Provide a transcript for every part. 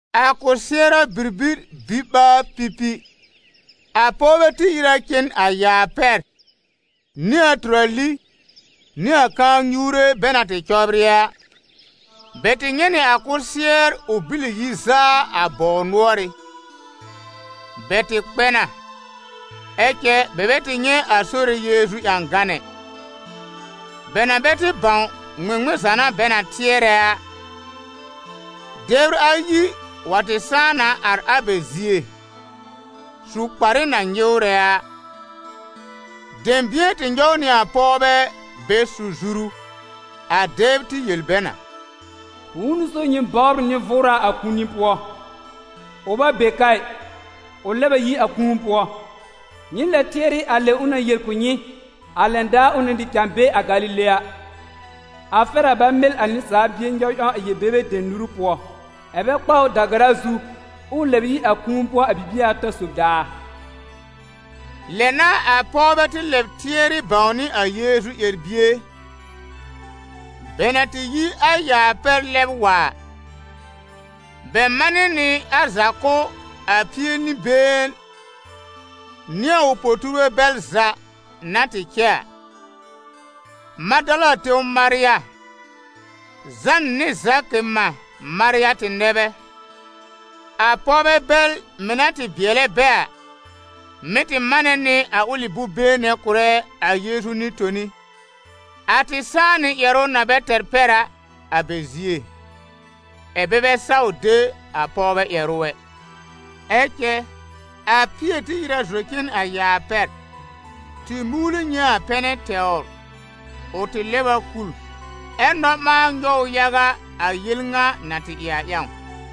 A kɔsɩɛra bibir biɓaar-pipi, a pɔwbɛ tɩ ìr a cen a yaa pɛr nɩ a tʋrali nɩ a kãa-nyuure bɛ na tɩ cɔbrɩ a. Bɛ tɩ nyɛ̃ nɩ a kʋsɩɛr ʋ bìlì yi zaa a bɔw nʋ́ɔrɩ́. Bɛ tɩ kpɛ na, ɛ cɛ bɛ bɛ tɩ nyɛ̃ a Sore Yeezu ƴãgan ɛ. Bɛ na bɛ tɩ bãw ŋmɩŋmɩn za n'a bɛ na tɩɛrɛ a, dɛbr ayi wa tɩ sãá na ar a bɛ zie, su kparɩ na nyɩwrɛ a. Dɛ̃bɩ̃ɛ tɩ nyɔw nɩ a pɔwbɛ bɛ su zuru. A dɛbr tɩ yel bɛ na: «Bʋ̃ʋ n'ʋ so nyɩ bɔbr nɩ-vʋʋra a kũuni pʋɔ? Ʋ bɛ be ka ɩ, ʋ lɛb a yi a kũu pʋɔ. Nyɩ lɛb tɩɛrɩ a lɛ ʋ na yel kʋ̀ nyɩ a lɛn daar ʋ na tɩ cãa be a Galile a: ‹A fɛr a bɛ mɩl a Nɩsaal Bie nyɔw ƴãw a yel-bebe dem nuru pʋɔ, ɛ́ bɛ kpa ʋ da-gara zu, ɛ ʋ lɛb yi a kũu pʋɔ a bibie ata sob daar.›» Lɛ n'a a pɔwbɛ tɩ lɛb tɩɛrɩ bãwnɩ a Yeezu ƴɛr-bie. Bɛ na tɩ yi a yaa pɛr lɛb wa a, bɛ manɩ nɩ a za kʋ̀ a Pie-nɩ-been nɩ a ʋ po-tuurbɛ bɛl za na tɩ cɛ a. Madala tẽw Marya, Zãn nɩ Zakɩ mã Marya tɩ nɛ bɛ. A pɔwbɛ bɛl mɩ̀ na tɩ bɩɛlɛ bɛ a, mɩ̀ tɩ manɛ nɩ a ʋlɩ bʋ̃-been nɛ kʋ̀rɛ a Yeezu nɩ-toni. A tɩ sãá nɩ ƴɛrʋ na bɛ tɛr pɛr a, a bɛ zie, ɛ̀ bɛ bɛ saw de a pɔwbɛ ƴɛrʋ ɛ. Ɛ cɛ a Pɩɛr tɩ ìr a zɔ cen a yaa pɛr, tɩ muuli nyɛ̃ a pɛnɛ tɛwr. Ʋ tɩ lɛb a kul, ɛ nɔ-ɓãa nyɔw ʋ yaga a yel ŋa na tɩ ɩ a ƴãw.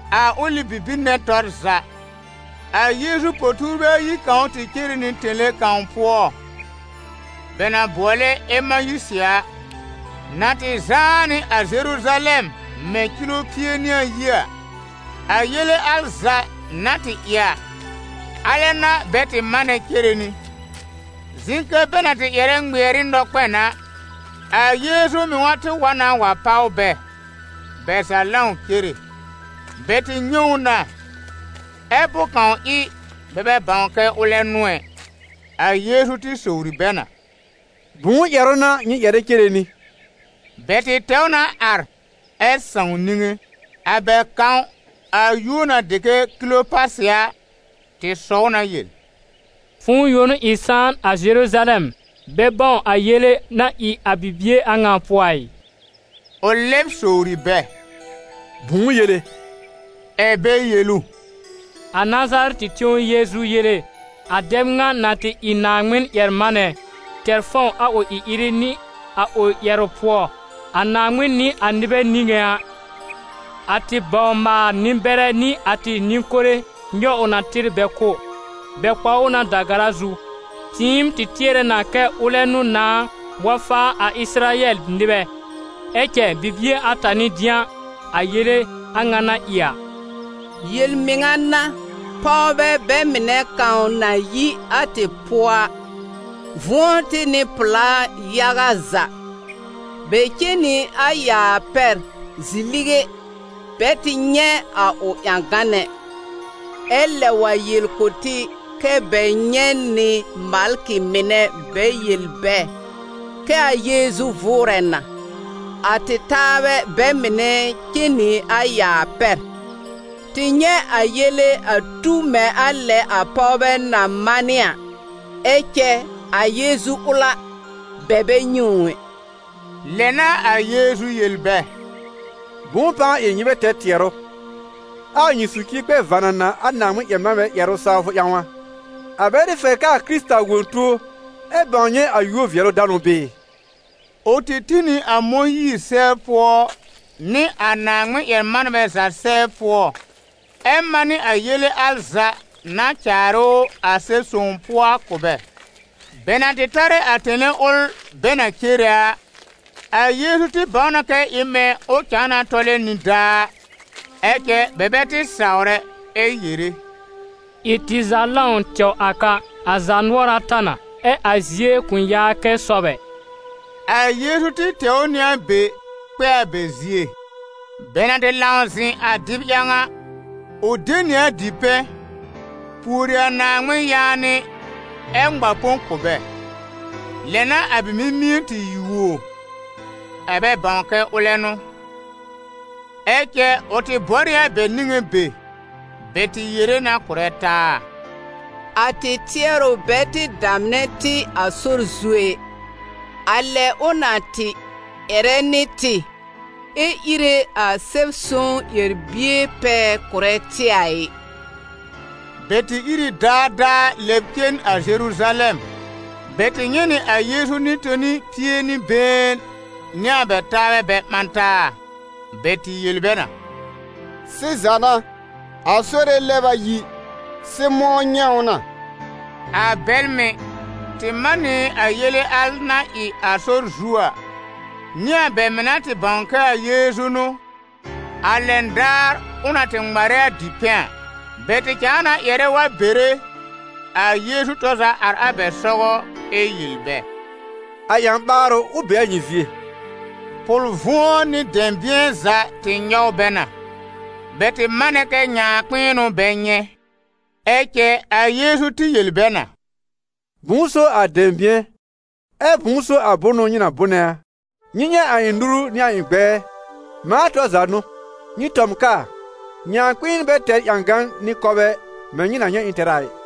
A ʋlɩ bibir nɛ tɔr za, a Yeezu po-tuurbɛ ayi kãw tɩ cere nɩ tẽle kãw pʋɔ bɛ na bʋɔlɛ Emayisɩ a, na tɩ zãá nɩ a Zeruzalɛm mɛ̃ kilo pie nɩ ayi a. A yele al za na tɩ ɩ a, alɛ n'a bɛ tɩ manɛ cere nɩ. Zɩ̃ kɛ bɛ na tɩ ƴɛrɛ ŋmɩɛr ɩ nɔ-kpɛn a, a Yeezu mɩŋa tɩ wa na wa páw bɛ, bɛ za lãw cere. Bɛ tɩ nyɛ̃ ʋ na, ɛ bʋ̃-kãw ɩ bɛ bɛ bãw kɛ ʋlɛ n'ʋ ɛ. A Yeezu tɩ sowri bɛ na: «Bʋ̃ʋ ƴɛrʋ n'a nyɩ ƴɛrɛ cere nɩ?» Bɛ tɩ tɛw na ar, ɛ sãw niŋe. A bɛ kãw, a yúor na dɩ kɛ Kilopasɩ a, tɩ sɔw na yel: «Fʋ̃ʋ yõ n'ʋ ɩ sãan a Zeruzalɛm, bɛ bãw a yele na ɩ a bibie a ŋa pʋɔ a ɩ?» Ʋ lɛb sowri bɛ: «Bʋ̃ʋ yele?» Ɛ bɛ yel ʋ: «A Nazarɛtɩ tẽw Yeezu yele: a dɛb ŋa na tɩ ɩ Naaŋmɩn-ƴɛr-manɛ, tɛr fãw a ʋ ɩ-ɩrɩ nɩ a ʋ ƴɛrʋ pʋɔ, a Naaŋmɩn nɩ a nɩbɛ niŋé a. A tɩ bawr-maal-nɩ-bɛrɛ nɩ a tɩ nɩ-kore nyɔw na tɩr bɛ kʋ́, bɛ kpa ʋ da-gara zu. Tɩɩm tɩ tɩɛrɛ na kɛ ʋlɛ n'ʋ nãá wa faa a Ɩsɩrayɛl nɩbɛ. Ɛ cɛ bibie ata n'ɩ dɩ̃a a yele a ŋa na ɩ a. Yel-mɩŋa n'a, pɔwbɛ bɛ mɩnɛ kãw na yi a tɩ pʋɔ a, vʋ̃ɔ tɩ nɩ pʋ̀lá yaga za: bɛ cen nɩ a yaa pɛr zi-lige, bɛ tɩ nyɛ̃ a ʋ ƴãgan ɛ. Ɛ lɛb wa yel kʋ̀ tɩ kɛ bɛ nyɛ̃ nɩ malkɩ mɩnɛ bɛ yel bɛ kɛ a Yeezu vʋʋrɛ na. A tɩ taabɛ bɛ mɩnɛ cen nɩ a yaa pɛr, tɩ nyɛ̃ a yele a tu mɛ̃ a lɛ a pɔwbɛ na manɩ a, ɛ cɛ a Yeezu ʋl a, bɛ bɛ nyɛ̃ ʋ ɛ». Lɛ n'a a Yeezu yel bɛ: «Bʋ̃ʋ pãa ɩ nyɩ bɛ tɛr tɩɛrʋ, ɛ a nyɩ socie kpɛ vanana a Naaŋmɩn-ƴɛr-manbɛ ƴɛrʋ sawfʋ ƴãw a? A bɛ tɩ fɛr kɛ a Kɩrɩta wõ tuo ɛ bãw nyɛ̃ a yúor-vɩɛlʋ-danʋ bɩɩ?» Ʋ tɩ tĩ nɩ a Mõyiir sɛbr pʋɔ nɩ a Naaŋmɩn-ƴɛr-manbɛ za sɛbr pʋɔ, ɛ manɩ a yele za na caarɩ ʋ a Sɛb-Son pʋɔ a kʋ̀ bɛ. Bɛ na tɩ tarɛ a tẽle ʋl bɛ na cere a, a Yeezu tɩ bãw na kɛ ɩ mɛ̃ ʋ cãa na tɔlɛ nidaa a. Ɛ cɛ bɛ bɛ tɩ sawr ɛ, ɛ yere: «Ɩ tɩ za lãw tɛw a ka, a zaanʋɔra ta na, ɛ a zie kʋ̃ yaa kɛ sɔb ɛ!» A Yeezu tɩ tɛw nɩ a be kpɛ a bɛ zie. Bɛ na tɩ lãw zɩ̃ a dɩb ƴãw a, ʋ de nɩ a dipɛ̃, pùori a Naaŋmɩn yaanɩ ɛ ŋma põ kʋ̀ bɛ. Lɛ n'a a bɛ mimie tɩ yuo ɛ bɛ bãw kɛ ʋlɛ n'ʋ. Ɛ cɛ ʋ tɩ bɔr ɩ a bɛ niŋé be. Bɛ tɩ yere na kʋ̀rɛ taa: «A tɩ tɩɛrʋ bɛ tɩ damnɛ tɩ a sɔr zu ɛ? A lɛ ʋ na tɩ ƴɛrɛ nɩ tɩ, ɛ ire a Sɛb-Son ƴɛr-bie pɛɛ kʋ̀rɛ tɩ a ɩ?» Bɛ tɩ ìr ɩ daadaa lɛ lɛb cen a Zeruzalɛm. Bɛ tɩ nyɛ̃ nɩ a Yeezu nɩ-toni pie nɩ been nɩ a bɛ taabɛ bɛ ɓã taa. Bɛ tɩ yel bɛ na: «Sɩza n'a, a Sore lɛb a yi, Sɩmʋ̃ nyɛ̃ ʋ na!» A bɛl mɩ̀ tɩ manɩ nɩ a yele al na ɩ a sɔr zu a, nɩ a bɛ mɩ̀ na tɩ bãw kɛ a Yeezu n'ʋ, a lɛn daar ʋ na tɩ ŋmarɛ a dipɛ̃ a. Bɛ tɩ cãa na ƴɛrɛ wa bere a Yeezu tɔr za ar a bɛ sɔgɔ, ɛ yel bɛ: «A ƴã-ɓaarʋ, ʋ be a nyɩ zie!» Pʋl-vʋ̃ɔ nɩ dɛ̃bɩ̃ɛ za tɩ nyɔw bɛ na: bɛ tɩ manɛ kɛ nyãakpɩ̃ɩn n'ʋ bɛ nyɛ̃. Ɛ cɛ a Yeezu tɩ yel bɛ na: «Bʋ̃ʋ n'ʋ so a dɛ̃bɩ̃ɛ, ɛ bʋ̃ʋ so a bʋnʋ nyɩ na bʋnɛ a? Nyɩ nyɛ̃ a ɩ̃ nuru nɩ a ɩ̃ gbɛɛ, mãa tɔr za n'ʋ! Nyɩ tɔ m kaa, nyãakpɩ̃ɩn bɛ tɛr ƴãgan nɩ kɔbɛ mɛ̃ nyɩ na nyɛ̃ ɩ̃ tɛr a ɩ.»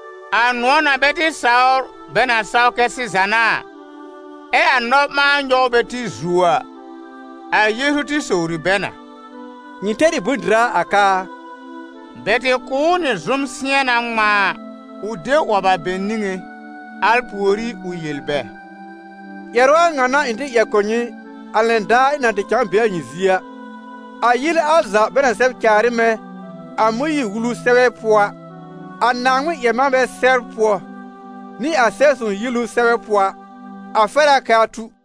A nʋ̃ɔ̀ na bɛ tɩ saw bɛ na saw kɛ sɩza n'a a, ɛ a nɔ-ɓãa nyɔw bɛ tɩ zuo a, a Yeezu tɩ sowri bɛ na: «Nyɩ tɛr ɩ bʋ̃-dɩra a ka a?» Bɛ tɩ kʋ̀ ʋ nɩ zʋm-sɩ̃ɛna ŋmãa, ʋ de 'wɔb a bɛ niŋé. Al pùorí ʋ yel bɛ: «Ƴɛrʋ a ŋa n'a ɩ̃ tɩ ƴɛr kʋ̀ nyɩ, a lɛn daar ɩ̃ na tɩ cãa be a nyɩ zie a: a yele al za bɛ na sɛb caar ɩ mɛ̃ a Mõyiir-Wulu sɛbɛ pʋɔ a, a Naaŋmɩn-ƴɛr-manbɛ sɛbr pʋɔ, nɩ a Sɛb-sõw yielu sɛbɛ pʋɔ a, a fɛr a kɛ a tu.»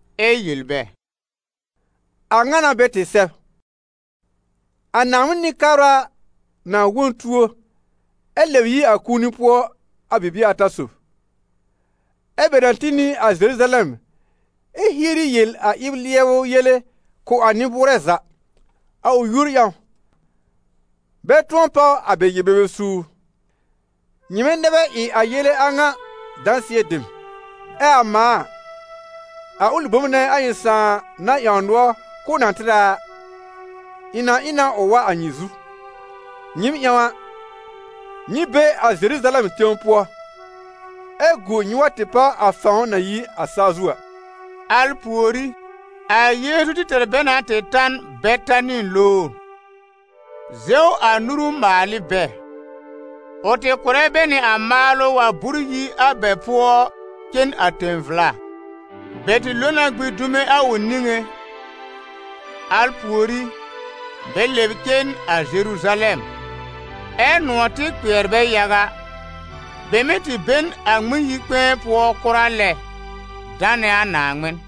ɛ yel bɛ: «A ŋa n'a bɛ tɩ sɛb: ‹A Naaŋmɩn Nɩ-kabra na wõ n tuo, ɛ lɛb yi a kũuni pʋɔ a bibie ata sob, ɛ́ bɛ na tĩ nɩ a Zeruzalɛm ɛ hieri yel a ɩb-lɩɛbʋ yele kʋ̀ a nɩ-bʋʋrɛ za, a ʋ yúor ƴãw, bɛ tʋ̃ɔ páw a bɛ yel-bebe suur.› Nyɩmɛ nɛ bɛ ɩ a yele a ŋa dãsɩɛ dem. Ɛ a mãa a, a ʋlɩ bom nɛ a ɩ̃ Sãà na ƴãw nʋɔr k'ʋʋ na tɩr a, ɩ̃ na ɩ na ʋ wa a nyɩ zu. Nyɩɩm ƴãw a, nyɩ be a Zeruzalɛm tẽw pʋɔ ɛ gu nyɩ wa tɩ páw a fãw na yi a saa zu a.» Al pùorí, a Yeezu tɩ tɛr bɛ na tɩ ta n Betani lowr, zɛw a nuru maal ɩ bɛ. Ʋ tɩ kʋ̀rɛ bɛ nɩ a maalʋ wa bʋ́r yi a bɛ pʋɔ cen a tẽ-vla. Bɛ tɩ lo na gbĩ dume a ʋ niŋé, al pùorí bɛ lɛb cen a Zeruzalɛm, ɛ́ nʋ̃ɔ̀ tɩ kpɩɛr bɛ yaga. Bɛ mɩ́ tɩ be n a Ŋmɩn-yi-kpɛ̃ɛ pʋɔ kʋra lɛ, danɛ a Naaŋmɩn.